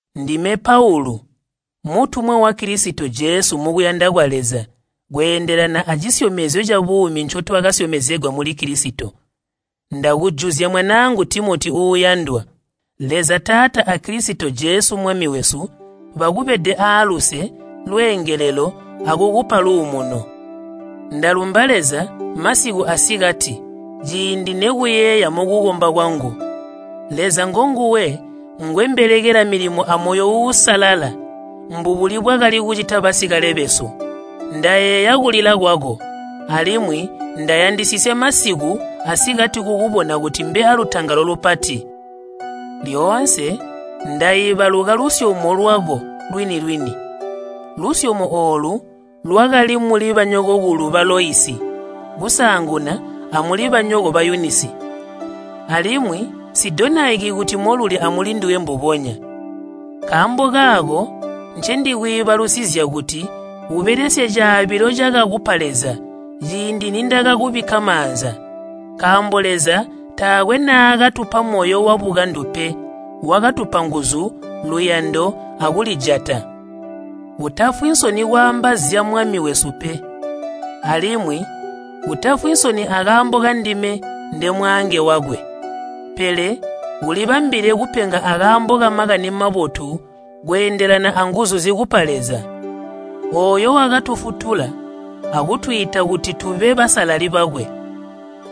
Ndime Paulu, mutumwa wa Kilisito Jesu mukuyanda kwa Leza kweendelana acisyomezyo cabuumi ncotwakasyomezegwa muli Kilisito. Ndakujuzya mwanaangu Timoti uuyandwa. Leza Taata a Kilisito Jesu Mwami wesu, bakubede aaluse, lweengelelo akukupa luumuno. Ndalumba Leza masiku asikati ciindi nekuyeeya mukukomba kwangu. Leza ngonguwe ngwembelekela milimo amoyo uusalala mbubuli bwakali kucita basikale besu. Ndayeeya kulila kwako, alimwi ndayandisisya masiku asikati kukubona kuti mbe alutangalo lupati. Lyoonse ndaibaluka lusyomo lwako lwini-lwini. Lusyomo oolu lwakali muli banyokokulu ba Loisi kusaanguna amuli banyoko ba Yunisi, alimwi nsidonaiki kuti moluli amulinduwe mbubonya. Nkaambo kaako ncendakwiibalusizya nkuti ubelesye caabilo cakakupa Leza ciindi nindakakubikka maanza. Nkaambo Leza taakwe naakatupa moyo wabukandu pe, wakatupa nguzu, luyando, akulijata. Utafwi nsoni kwaamba zya Mwami wesu pe, alimwi utafwi nsoni akaambo kandime ndemwaange wakwe. Pele ulibambile kupenga akaambo ka Makani Mabotu kweendelana anguzu zikupa Leza. Ooyo wakatufutula akutwiita kuti tube basalali bakwe.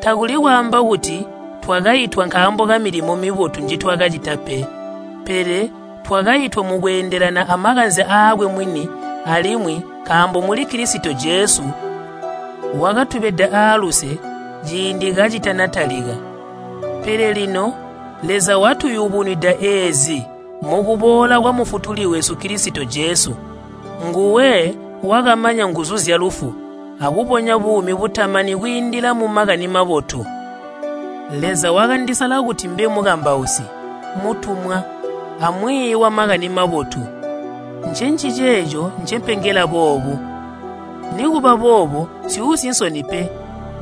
Takuli kwaamba kuti twakaitwa nkaambo kamilimo mibotu njitwakacita pe, pele twakaitwa mukweendelana amakanze aakwe mwini alimwi nkaambo muli Kilisito Jesu wakatubeda aaluse ciindi kacitanatalika. Pele lino Leza watuyubunwida eezi mukuboola kwa Mufutuli wesu Kilisito Jesu, nguwe wakamanya nguzu zyalufu akubonya buumi butamani kwiindila mu Makani Mabotu. Leza wakandisala kuti mbe mukambausi, mutumwa, amwiiyi wa Makani Mabotu. Ncenciceeco ncempengela boobu. Nikuba boobo nsyuusi nsoni pe,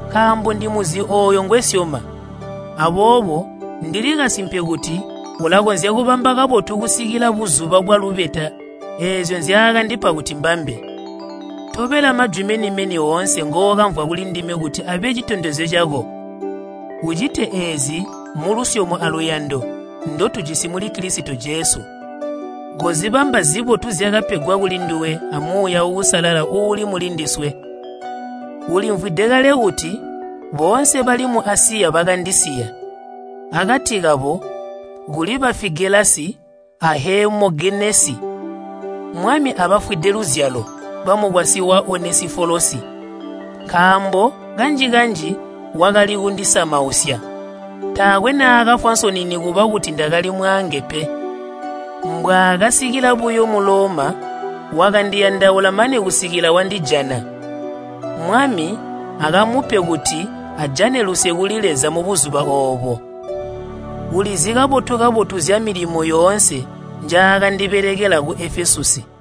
nkaambo ndimuzi ooyo ngwesyoma. Aboobo ndili kasimpe kuti ulakonzya kubamba kabotu kusikila buzuba bwalubeta eezyo nzyaakandipa kuti mbambe. Tobela majwi meni-meni oonse ngookamvwa kulindime kuti abe citondezyo cako. Ucite eezi mulusyomo aluyando ndotujisi muli Kilisito Jesu. Kozibamba zibotu zyakapegwa kulinduwe a Muuya Uusalala uuli mulindiswe. Ulimvwide kale kuti boonse bali mu Asiya bakandisiya. Akati kabo kuli ba Figelasi a Heemogenesi. Mwami abafwide luzyalo bamukwasyi wa Onesifolosi, nkaambo kanji-kanji wakali kundisamausya. Taakwe naakafwa nsoni nikuba kuti ndakali mwaange pe. Mbwaakasikila buyo mu Loma, wakandiyandaula mane kusikila wandijana. Mwami akamupe kuti ajane luse kuli Leza mubuzuba oobo. Ulizi kabotu-kabotu zyamilimo yoonse njaakandibelekela ku Efesusi.